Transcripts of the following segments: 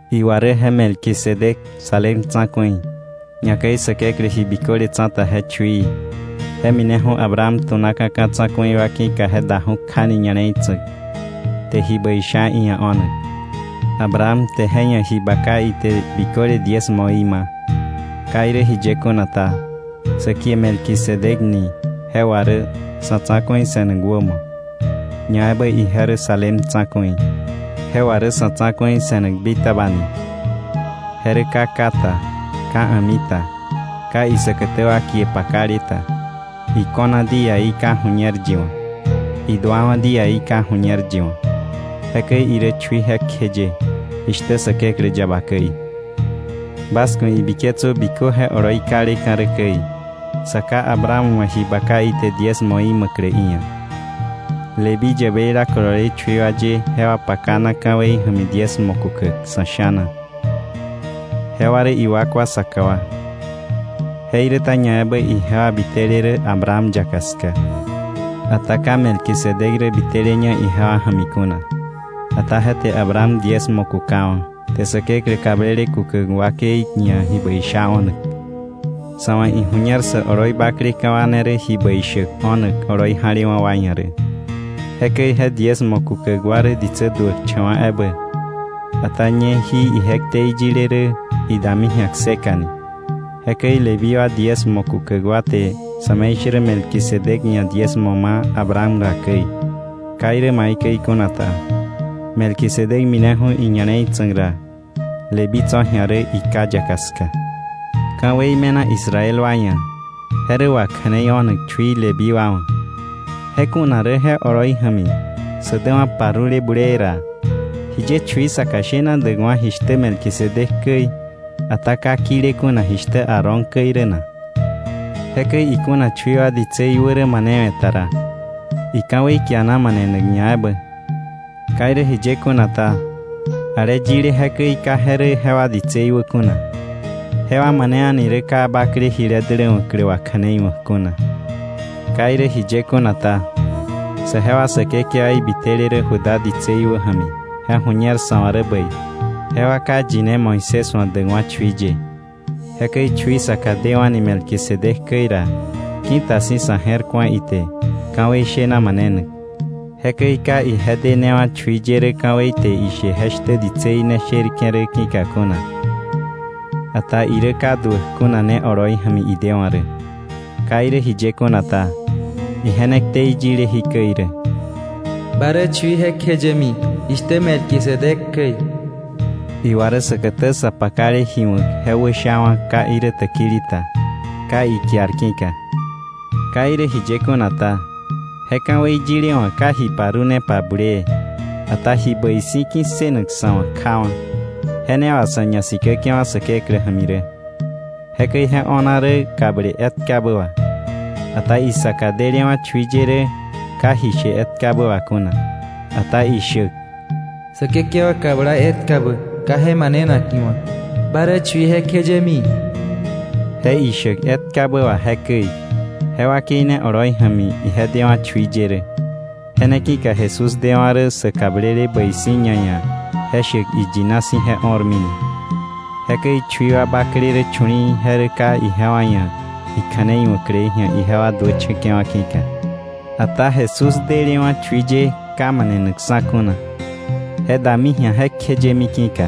Iwa rä je Melquisedec, Salem tsa̱ku̱i, ñakäi Säkeklä Ji Biköle Tsa̱ta je chuií, je mineju̱ Abraham tu̱naka̱ ka̱ tsa̱ku̱i wa ki̱ka je daju̱ kjani ña̱le̱i tsa̱k, te ji bäi sha iia̱ o̱nak. Abraham te je ia̱ ji baka ite biköle diezmoí ma̱. Ka irä jiye kuna ta, sä kie Melquisedec ni je wà rä “Sa̱tsa̱ku̱i se̱nak wämo”, ñaebä ije rä Salem Tsa̱ku̱i; je wà rä “Sa̱tsa̱ku̱i se̱nak bitaba” ni. Je rä ka ká ta, ka a̱mi ta, ka isäkätä wa kie pakale ta, iko̱na díaí ka ju̱ñer yi wa̱, iduawa̱ díaí ka ju̱ñer yi wa̱. Jekäi irä chui jekjeye, jishtä Säkeklä yaba käi. Bas ku̱ ibiketsö bikö je oloi kaleka̱ rä käi, sa ká Abraham wa̱ ji baka ite diezmoí ma̱klä iia̱. Leví yäbeila kolole chui wa ye jewa pakana ka̱wei ja̱mi diezmo kukäk sa̱ sha̱na, jewa rä iwakwa saka wa, jeiräta ñaebä ijewa biteleté rä Abraham yaka ska. Ata ka Melquisedec rä biteleña ijewa ja̱mi kuna, ata je te Abraham diezmo kukawa̱, te Säkeklä kablele kukäk wakei ia̱ ji bäi sha o̱nak. Sa̱ wa̱ iju̱ñer sä oloi bakleka̱ wa ne rä ji bäi shäk o̱nak oloi ja̱lewa̱ wa ia̱ rä. Jekäi je diezmo kukäk wa rä ditsä duäkcha̱wa̱ ebä, ata ñe jí ije ktei yile rä idami ji̱a kseka ni. Jekäi Leví wa diezmo kukäk wa te sa̱me̱ishärä Melquisedec ia̱ diezmo ma̱ Abraham ra käi. Ka irä maikäi kuna ta, Melquisedec mineju̱ iña̱le̱i tsa̱k ra, Leví tso̱ ji̱a rä iká yaka ska. Ka̱wei me̱na Israel wa ia̱, je rä wakja̱neio̱nak chui Leví wa wa̱, je kuna rä je oloi ja̱mi sä däwa̱ parule bulee ra, ¿jiye chui saka shena däkwa̱ jishtä Melquisedec käi, ata ka kile kuna jishtä Aarón käi rä na? Jekäi ikuna chui wa ditsei wä rä manewe̱ ta ra, ika̱wei kiana manenak ñaebä. Ka irä jiye kuna ta, ale yile jekäi, ka je rä jewa ditsei wä kuna. Jewa mane a̱ni rä ka bakle jile däläwa̱klä wakja̱neiwa̱k kuna. Ka irä jiye kuna ta, saje wa Säkekewaí bitele rä Judá ditsei wä ja̱mi je ju̱ñer sa̱ wa̱ rä bäi, jewa ka yine Moisés wa̱ däkwa̱ chui ye. Jekäi chui saka dewa̱ni Melquisedec käi ra, ki̱ta si̱ sa̱ je̱r ku̱a ite ka̱wei shena manenak. Jekäi ka ije denewa̱ chui ye rä ka̱wei te ishe je shtä ditsei ne sherke̱ rä ki̱ka kuna, ata irä ka duäk kuna ne oloi ja̱mi idewa̱ rä. Ka irä jiye kuna ta, ije ne ktei yile jikäi rä: “Ba rä chui jekjeyemi, jishtä Melquisedec käi.” Iwa rä säkätä sa pakale ji wa̱k je wäshawa̱ ka irä täkili ta, ka ikiar ki̱ka. Ka irä jiye kuna ta, je ka̱wei yile wa̱ ka ji parunepa bulee, ata ji bäi si̱ ki̱ssënak sa̱ wa̱ kjawa̱, je ne wà sa̱ ñasikäke̱wa̱ Säkeklä ja̱mi rä. Jekäi je o̱na rä kable etkabä wà. Ata isaka delewa̱ chui ye rä ka ji she etkabä wà kuna. Ata ishäk: “Säkekewa kabla etkabä, ka je manenak iwa̱: ‘Ba rä chui jekjeyemi.’” Je ishäk etkabä wà jekäi, je wakei ne oloi ja̱mi ije dewa̱ chui ye rä. Je ne ki̱ka Jesús dewa̱ rä sä kablele bäi si̱ ñaia̱, je shäk iyina si̱ je o̱rmi ni. Jekäi chui wa bakle rä chu̱li̱i̱, je rä ka ijewa ia̱ ikja̱nei wa̱klei ji̱a ijewa duächa̱ke̱wa̱ ki̱ka. Ata Jesús dä delewa̱ chui ye ka manenakksa̱ kuna, je dami ji̱a jekjeyemi ki̱ka.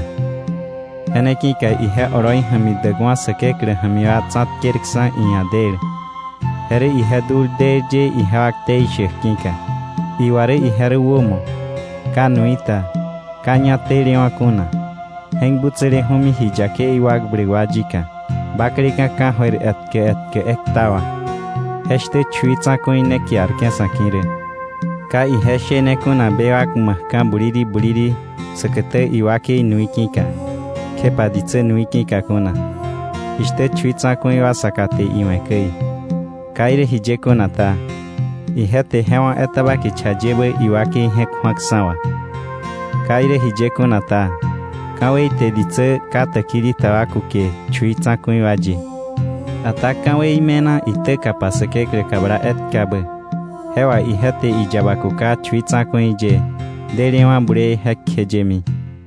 Je ne ki̱ka ije oloi ja̱mi däkwa̱ Säkeklä ja̱mi wa tsa̱tkerksa̱ iia̱ del. Je rä ije dul del ye ijewa ktei shäk ki̱ka. Iwa rä ije rä wämo, ka nui ta, ka ñá telewa̱ kuna, je̱k butsäleju̱mi ji yakei wakbläk wa yika, bakleka̱ ka̱jöir etkä etkä ekta wà. Jeshtä chui tsa̱ku̱i ne kiarke̱ sa̱ ki̱ rä. Ka ije shene kuna bewak ma̱kka̱ buliri buliri säkätä iwakei nui ki̱ka, kjepa ditsä nui ki̱ka kuna, jishtä chui tsa̱ku̱i wa saka te iwe̱ käi. Ka irä jiye kuna ta, ije te je wá̱ etaba kicha yebä iwakei je̱k ju̱aksa̱ wà. Ka irä jiye kuna ta, ka̱wei te ditsä ka täkili ta wa kuke chui tsa̱ku̱i wa ye, ata ka̱wei me̱na itäkapa Säkeklä kabla etkabä. Je wà ije te iyaba kuka chui tsa̱ku̱i ye, delewa̱ bulee jekjeyemi.